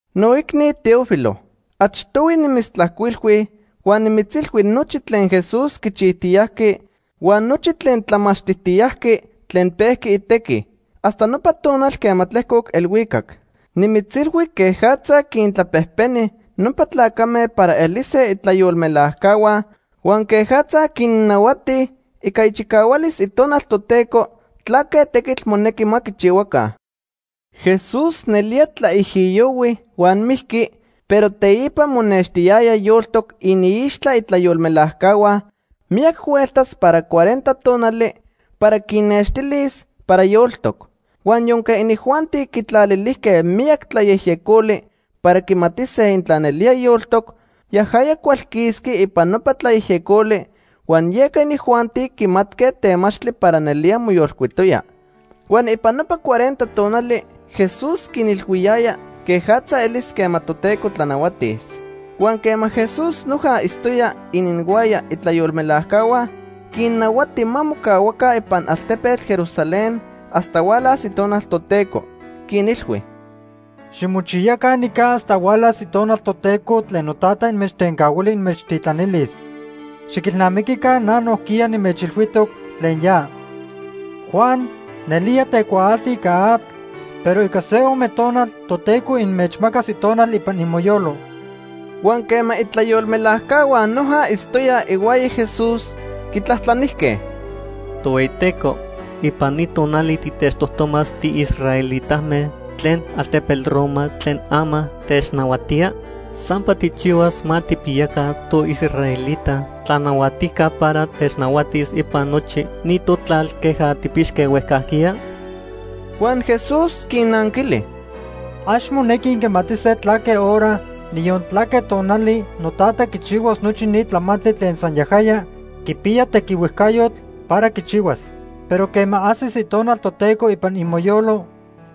Noicni Teófilo, achtohui nimitztlajcuilhui huan nimitzilhui nochi tlen Jesús quichijtiyajqui huan nochi tlen tlamachtijtiyajqui tlen pejqui itequi, hasta nopa tonal quema tlejcoc elhuicac. Nimitzilhui quejatza quintlapejpeni nopa tlacame para elise itlayolmelajcahua huan quejatza quinnahuati ica ichicahualis Itonal Toteco tlaque tequitl monequi ma quichihuaca. Jesús nelía tlaijiyohui huan mijqui, pero teipa monextiyaya yoltoc iniixtla itlayolmelajcahua miyac hueltas para cuarenta tonali para quinnextilis para yoltoc. Huan yonque inijuanti quitlalilijque miyac tlayejyecoli para quimatise intla nelía yoltoc, yajaya cualquisqui ipan nopa tlayejyecoli huan yeca inijuanti quimatque temachtli para nelía moyolcuitoya. Huan ipan nopa cuarenta tonali Jesús quinilhuiyaya quejatza elis quema Toteco tlanahuatis. Huan quema Jesús noja itztoya ininhuaya itlayolmelajcahua, quinnahuati ma mocahuaca ipan altepetl Jerusalén hasta hualas Itonal Toteco. Quinilhui: ―Ximochiyaca nica hasta hualas Itonal Toteco tlen Notata inmechtencahuili inmechtitlanilis. Xiquilnamiquica na nojquiya nimechilhuijtoc tlen ya. Juan nelía tecuaalti ica atl, pero ica se ome tonal Toteco inmechmacas Itonal ipan imoyolo. Huan quema itlayolmelajcahua noja itztoyaj ihuaya Jesús, quitlajtlanijque: ―Tohueyiteco, ¿ipan ni tonali titechtojtomas tiisraelitame tlen altepetl Roma tlen ama technahuatía? ¿Sampa tijchihuas ma tijpiyaca toisraelita tlanahuatijca para technahuatis ipan nochi ni totlal queja tijpixque huejcajquiya? Huan Jesús quinnanquili: ―Ax monequi inquimatise tlaque hora, niyon tlaque tonali noTata quichihuas nochi ni tlamantli tlen san yajaya quipiya tequihuejcayotl para quichihuas. Pero quema ajsis Itonal Toteco ipan imoyolo,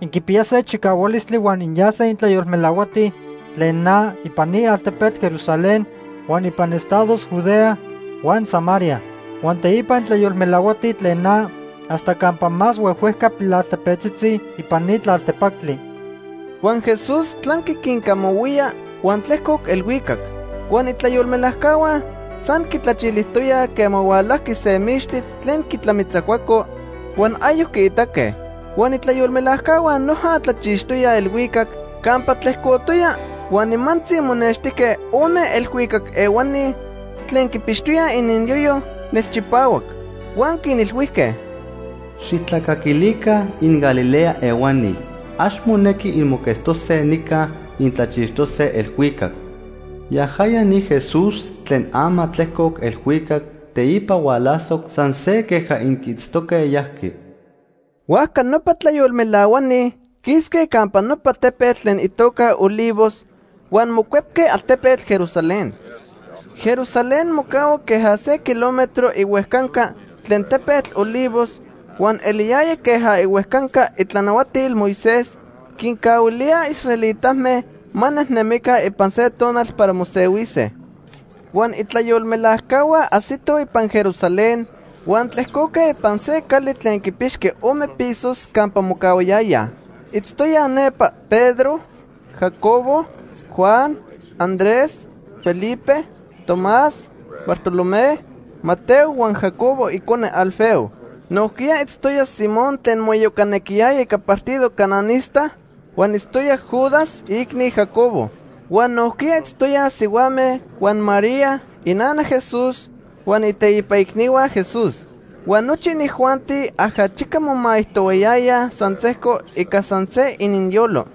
inquipiyase chicahualistli huan inyase intlayolmelahuatij tlen na ipan ni altepetl Jerusalén, huan ipan estados Judea huan Samaria. Huan teipa intlayolmelahuatij tlen na hasta campa más huejhuejca pilaltepetzitzi ipan ni tlaltepactli. Huan Jesús tlanqui quincamahuía huan tlejcoc elhuicac. Huan itlayolmelajcahua san quitlachilijtoyaj quema hualajqui se mixtli tlen quitlamitzacuaco, huan ayoc quiitaque. Huan itlayolmelajcahua noja tlachixtoyaj elhuicac campa tlejcotoya huan nimantzi monextijque ome elhuicac ehuani tlen quipixtoyaj ininyoyo nelchipahuac. Huan quinilhuijque: ―Xijtlacaquilica inGalilea ehuani, ax monequi inmoquetztose nica intlachixtoque elhuicac. Yajaya ni Jesús tlen ama tlejcoc elhuicac teipa hualasoc san se queja inquiitztoque yajqui. Huajca nopa tlayolmelahuani quisque campa nopa tepetl tlen itoca Olivos, huan mocuepque altepetl Jerusalén. Jerusalén mocahua queja se kilómetro ihuejcanca tlen tepetl Olivos, huan eliyaya queja ihuejcanca itlanahuatil Moisés quincahuilíaj israelitame ma nejnemica ipan se tonal para mosehuise. Huan itlayolmelajcahua ajsitoj ipan Jerusalén huan tlejcoque ipan se cali tlen quipixqui ome pisos campa mocahuayayaj. Itztoyaj nepa Pedro, Jacobo, Juan, Andrés, Felipe, Tomás, Bartolomé, Mateo huan Jacobo icone Alfeo. Nojquiya itztoya Simón tlen moiyocanequiyaya ica partido cananista, huan itztoya Judas, iicni Jacobo. Huan nojquiya itztoyaj sihuame huan María, inana Jesús, huan iteipa icnihua Jesús. Huan nochi inijuanti ajachica momaijtohuayayaj san sejco ica san se ininyolo.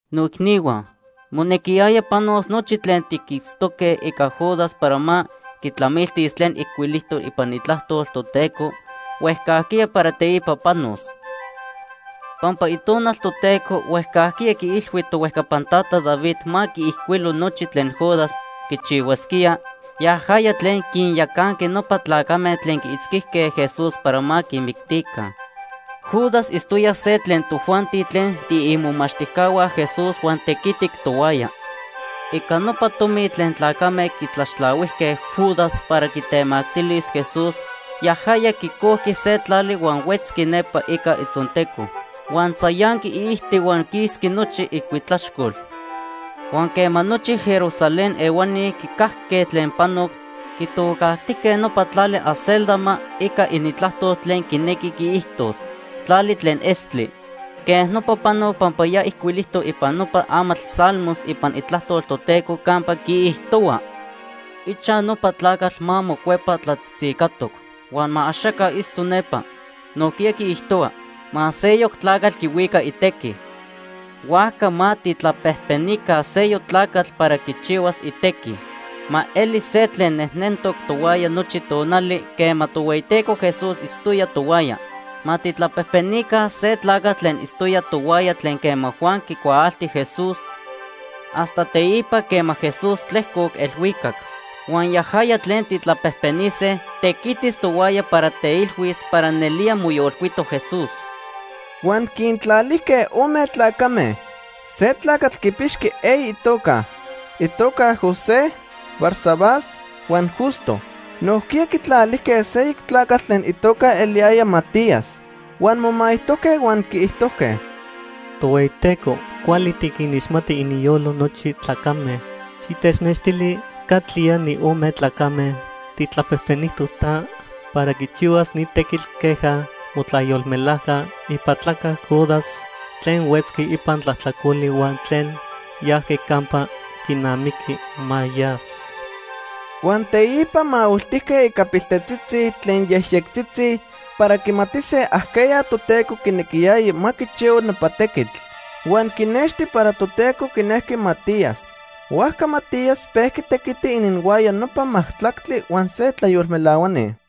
“Noicnihua, monequiyaya panos nochi tlen tiquitztoque ica Judas para ma quitlamiltis tlen ijcuilijtoc ipan Itlajtol Toteco huejcajquiya para teipa panos. Pampa Itonal Toteco huejcajquiya quiilhui tohuejcapan tata David ma quiijcuilo nochi tlen Judas quichihuasquía, yajaya tlen quinyacanqui nopa tlacame tlen quiitzquijque Jesús para ma quimictica. Judas itztoya se tlen tojuanti tlen tiimomachtijcahua Jesús huan tequitic tohuaya. Ica nopa tomi tlen tlacame quitlaxtlahuijque Judas para quitemactilis Jesús, yajaya quicojqui se tlali huan huetzqui nepa ica itzonteco. Huan tzayanqui iijti huan quisqui nochi icuitlaxcol. Huan quema nochi Jerusalén ehuani quicajque tlen panoc, quitocajtijque nopa tlali ‘Acéldama’, ica inintlajtol tlen quinequi quiijtos, ‘Tlali tlen Estli’. Quej nopa panoc pampa ya ijcuilijtoc ipan nopa amatl Salmos ipan Itlajtol Toteco campa quiijtohua: ‘Ichaj nopa tlacatl ma mocuepa tlatzitzicatoc huan ma axaca itzto nepa.’ Nojquiya quiijtohua: ‘Ma seyoc tlacatl quihuica itequi.’ “Huajca ma tijtlapejpenica seyoc tlacatl para quichihuas itequi. Ma elis se tlen nejnentoc tohuaya nochi tonali quema Tohueyiteco Jesús itztoya tohuaya. Ma tijtlapejpenica se tlacatl tlen itztoya tohuaya tlen quema Juan quicuaalti Jesús hasta teipa quema Jesús tlejcoc elhuicac. Huan yajaya tlen tijtlapejpenise tequitis tohuaya para teilhuis para nelía moyolcuitoc Jesús.” Huan quintlalijque ome tlacame. Se tlacatl quipixqui eyi itoca. Itoca José, Barsabás, huan Justo. Nojquiya quitlalijque seyoc tlacatl tlen itoca eliyaya Matías. Huan momaijtojque huan quiijtojque: “Tohueyiteco, cuali tiquinixmati ininyolo nochi tlacame. Xitechnextili catlía ni ome tlacame tijtlapejpenijtoc ta, para quichihuas ni tequitl queja motlayolmelajca ipatlaca Judas tlen huetzqui ipan tlajtlacoli huan tlen yajqui campa quinamiqui ma yas.” Huan teipa mahuiltijque ica piltetzitzi tlen yejyectzitzi para quimatise ajqueya Toteco quinequiyaya ma quichihua nopa tequitl. Huan quinexti para Toteco quinejqui Matías. Huajca Matías pejqui tequiti ininhuaya nopa majtlactli huan se tlayolmelahuani.